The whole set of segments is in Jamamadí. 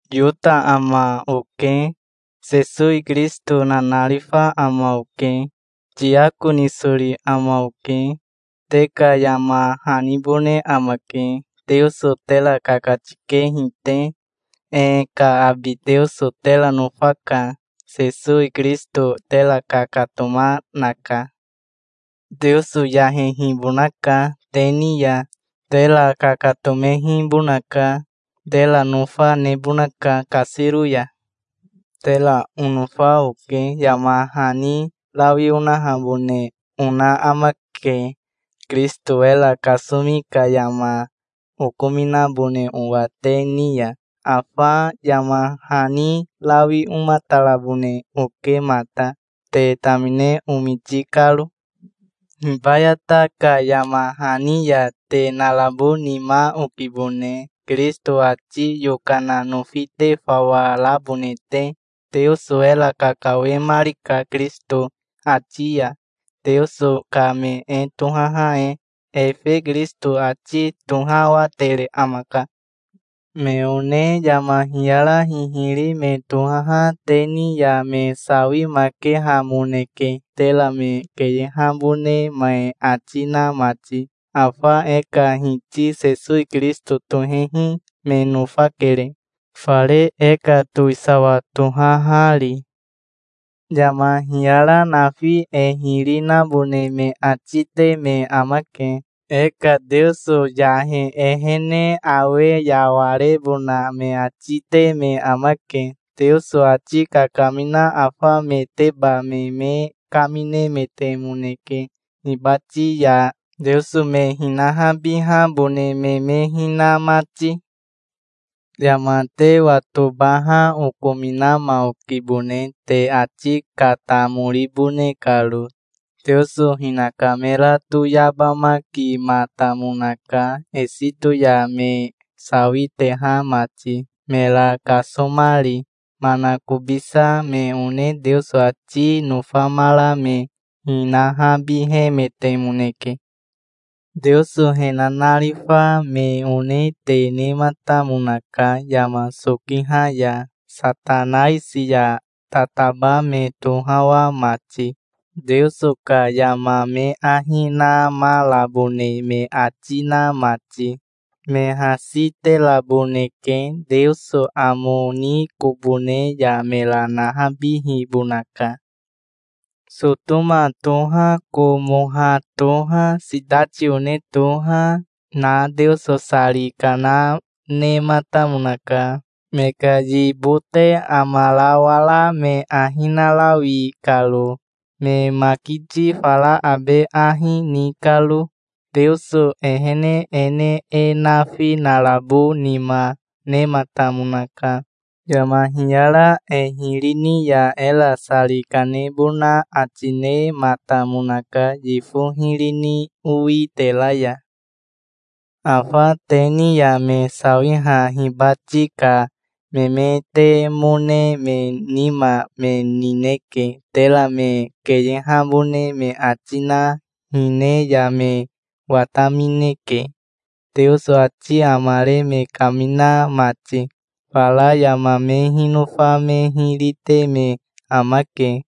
Yota ama oke. Sesowi Kirisito nanarifa ama oke. Tiako nisori ama oke. Te ka yama hanibone amake, Teoso tera kakatikehi te. E ka abi Teoso tera nofaka. Sesowi Kirisito tera kakatoma, naka. Teoso yahehibonaka te ni ya. Tera kakatomehibonaka. Tera nofa nebonaka, kasiro ya. Tera onofa oke. Yama hani rawi onahabone ona amake, Kirisito era kasomi ka yama okominabone owa te ni ya. Afa yama hani rawi omatarabone oke mata, te tamine omiti karo. Hibayata ka yama hani ya te narabo nima okibone, Kirisito ati yokana nofi te fawa rabone te. Teoso era kakawemarika Kirisito ati ya, Teoso ka me e tohaha e. Efe Kirisito ati tohawatere amaka. Me one yama hiyara hihiri me tohaha te ni ya me sawimakehamoneke, tera me keyehabone me ati na mati. Afa e ka Hiti Sesowi Kirisito tohehi me nofakere, fare e ka towisawa tohahari. Yama hiyara nafi e hiri nabone me ati te me amake. E ka Teoso yahe e ehene awe yawarebona me ati te me amake. Teoso ati kakamina afa meteba me me kaminemetemoneke hibati ya, Teoso me hinahabihabone me me hina mati. Yama te watobaha okominama okibone, te ati katamoribone karo. Teoso hinaka mera toyabamakimatamonaka, Esito ya me sawiteha mati, mera kasomari. Manakobisa me one Teoso ati nofamara me hinahabihemetemoneke. Teoso he nanarifa me one te nematamonaka yama sokiha ya, Satanaisi ya tataba me tohawa mati, Teoso ka yama me ahi namarabone me ati na mati. Me hasi teraboneke. Teoso amo ni kobo ne ya mera nahabihibonaka. Sotoma toha, Komoha toha, sitati one toha, na Teoso sari kana nematamonaka, me ka yibote amarawara me ahi narawi karo, me makiti fara abe ahi, ni karo. Teoso ehene e ne e nafi narabo nima nematamonaka. Yama hiyara e hiri ni ya era sari kanebona ati nematamonaka yifo hiri ni owitera ya. Afa te ni ya me sawiha hibati ka memetemone me nima me nineke. Tera me keyehabone me ati na hine ya me watamineke, Teoso ati amare me kamina mati. Fara yama me hinofa me hiri te me amake,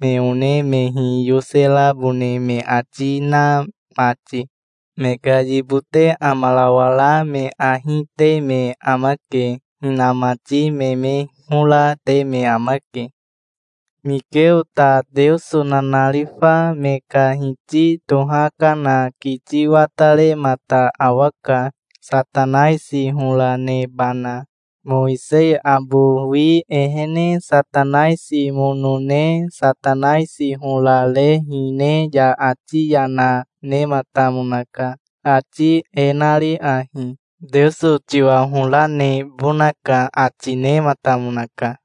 me one me hiyoserabone me ati na mati. Me ka yibote amarawara me ahi, te me amake. Hinamati me me hora te me amake. Mikeo ta Teoso nanarifa me ka hiti tohakana kiti wataremata awaka, Satanaisi hora nebana. Mowisei abowi ehene Satanaisi mono ne Satanaisi hora re hine ya ati yana nematamonaka, ati e nari ahi: "Teoso tiwa hora nebonaka", ati nematamonaka.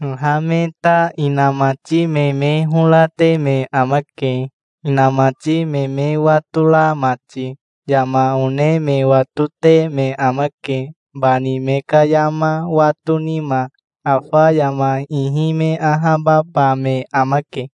Haha me ta inamati me me hora te me amake, inamati me me watora mati. Yama one me watote me amake, bani me ka yama wato nima. Afa yama ihi me ahababa me amake.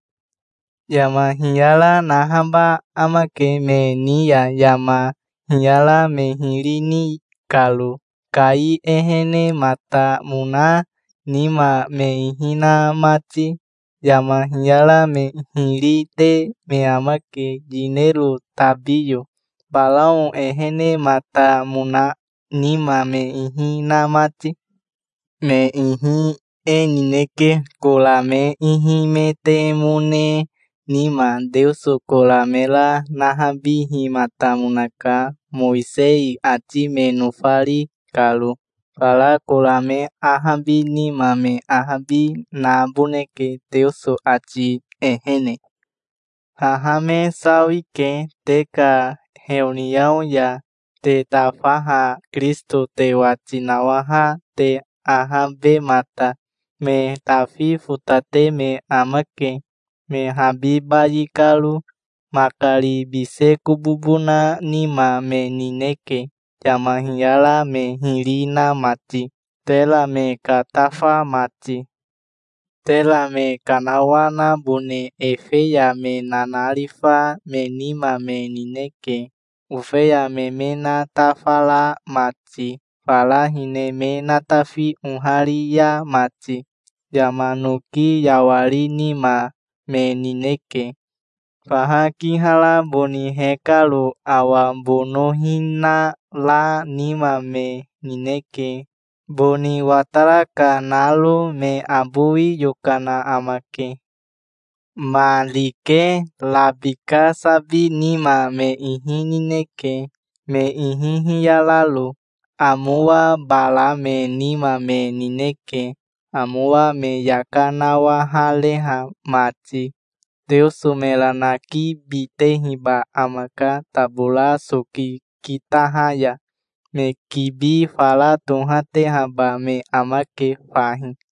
Yama hiyara nahaba amake me ni ya, yama hiyara me hiri ni karo, Kai ehenematamona nima me ihi na mati. Yama hiyara me hiri te me amake, yinero tabiyo, Barao ehenematamona nima me ihi na mati. Me ihi e nineke, Kora me ihimetemone nima. Teoso Kora mera nahabihimatamonaka, Mowisei ati me nofari karo. Fara Kora me ahabi nima me ahabi naboneke, Teoso ati ehene. Haha me sawike, te ka heoniao ya te tafaha Kirisito te wati nawaha te, ahabemata. Me tafi fotate me amake, me habi bayi karo. Makari bise kobobo na nima me nineke, yama hiyara me hiri na mati, tera me katafa mati. Tera me kanawanabone ofeya me nanarifa me nima me nineke, ofeya me me natafara mati, fara hine me natafi oharia mati. Yama noki yawari nima me nineke, faha kihara boni hekaro. Awa bonohina ra nima me nineke, boni watara ka naro. Me abowi yokana amake. Ma rike rabika sabi nima me ihi nineke, me ihi hiyararo. Amowa bara me nima me nineke, amowa me yaka nawahareha mati. Teoso mera nakibitehiba amaka tabora soki kitaha ya. Me kibi fara tohatehaba me amake fahi.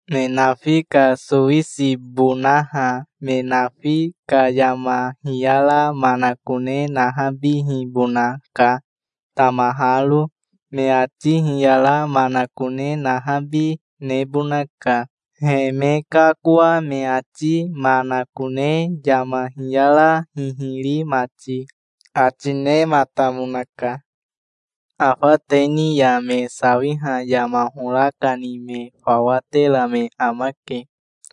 me nafi ka sowisibonaha. Me nafi ka yama hiyara manakone nahabihibonaka, tamaharo. Me ati hiyara manakone nahabi nebonaka, he me kakoa me ati manakone, yama hiyara hihiri mati", ati nematamonaka. Afa te ni ya me sawiha yama hora kani me fawa tera me amake.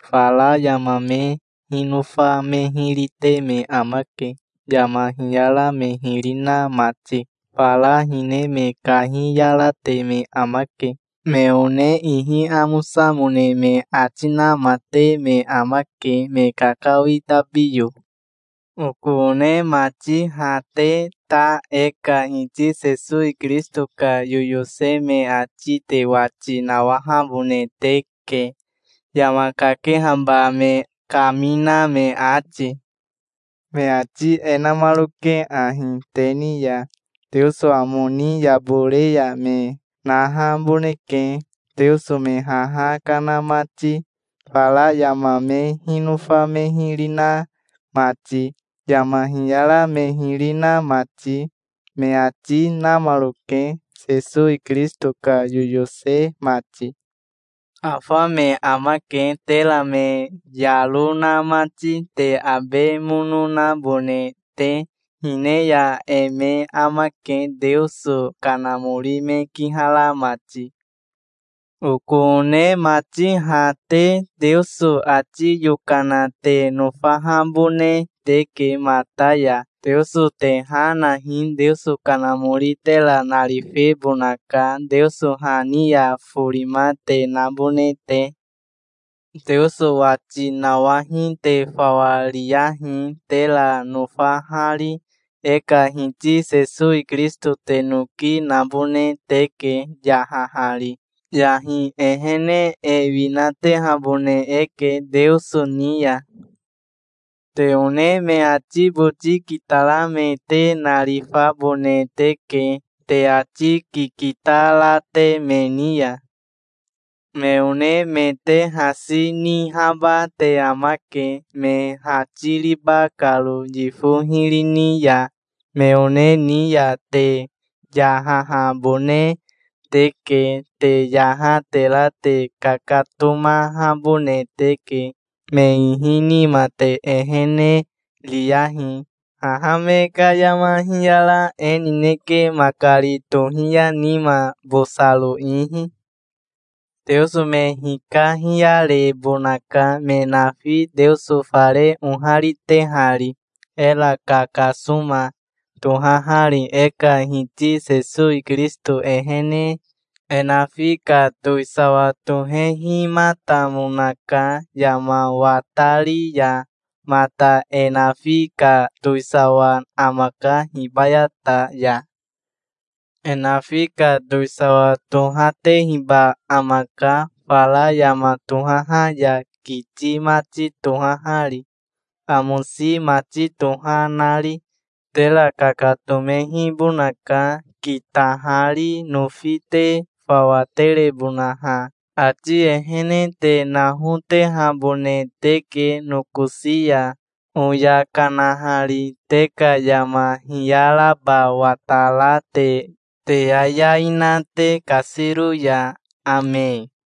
Fara yama me hinofa me hiri te me amake, yama hiyara me hiri na mati. Fara hine me kahiyarate me amake. Me one ihi amosamone me ati nama te me amake, me kakawi tabiyo. Oko one mati, ha te ta e ka Hiti Sesowi Kirisito ka yoyose me ati te wati nawahabone teke, yama kakehaba me kamina me ati. Me ati e namaroke ahi te ni ya: "Teoso amo ni yabore ya me nahaboneke, Teoso me haha kana mati, fara yama me hinofa me hiri na mati, yama hiyara me hiri na mati", me ati namaroke, Sesowi Kirisito ka yoyose mati. Afa me amake, tera me yaro na mati, te abe mono nabone te. Hine ya e me amake, Teoso Kanamori me kihara mati. Oko one mati, ha te Teoso ati yokana te nofahabone teke mata ya. Teoso te ha nahi. Teoso Kanamori tera narifebonaka, Teoso ha ni forima te nabone te. Teoso wati nawahi te fawa riyahi, tera nofahari. E ka Hiti Sesowi Kirisito te noki nabone teke, yahahari. Yahi ehene e winatehabone eke Teoso ni ya. Te one me ati boti kitara me te narifabone teke, te ati kikita ra te me ni ya. Me one me te hasi nihaba te amake, me hatiriba karo yifo hiri ni ya. Me one ni ya te yahahabone teke. Te yaha tera te kakatomahabone teke. Me ihi nima te ehene riyahi. Haha me ka yama hiyara e nineke, makari tohiya nima, bosaro ihi. Teoso me hikahiyarebonaka, me nafi, Teoso fare oharitehari, era kakasoma tohahari, e ka Hiti Sesowi Kirisito ehene. E nafi ka towisawa tohehimatamonaka, yama watari ya mata. E nafi ka towisawa amaka hibayata ya. E nafi ka towisawa tohatehiba amaka, fara yama tohaha ya, kiti mati tohahari, amosi mati toha nari. Tera kakatomehibonaka, kitahari, nofi te fawa terebonaha. Ati ehene te nahotehabone teke nokosi ya, oya kanahari, te ka yama hiyaraba watara te, te yayai na te kasiro ya. Ame.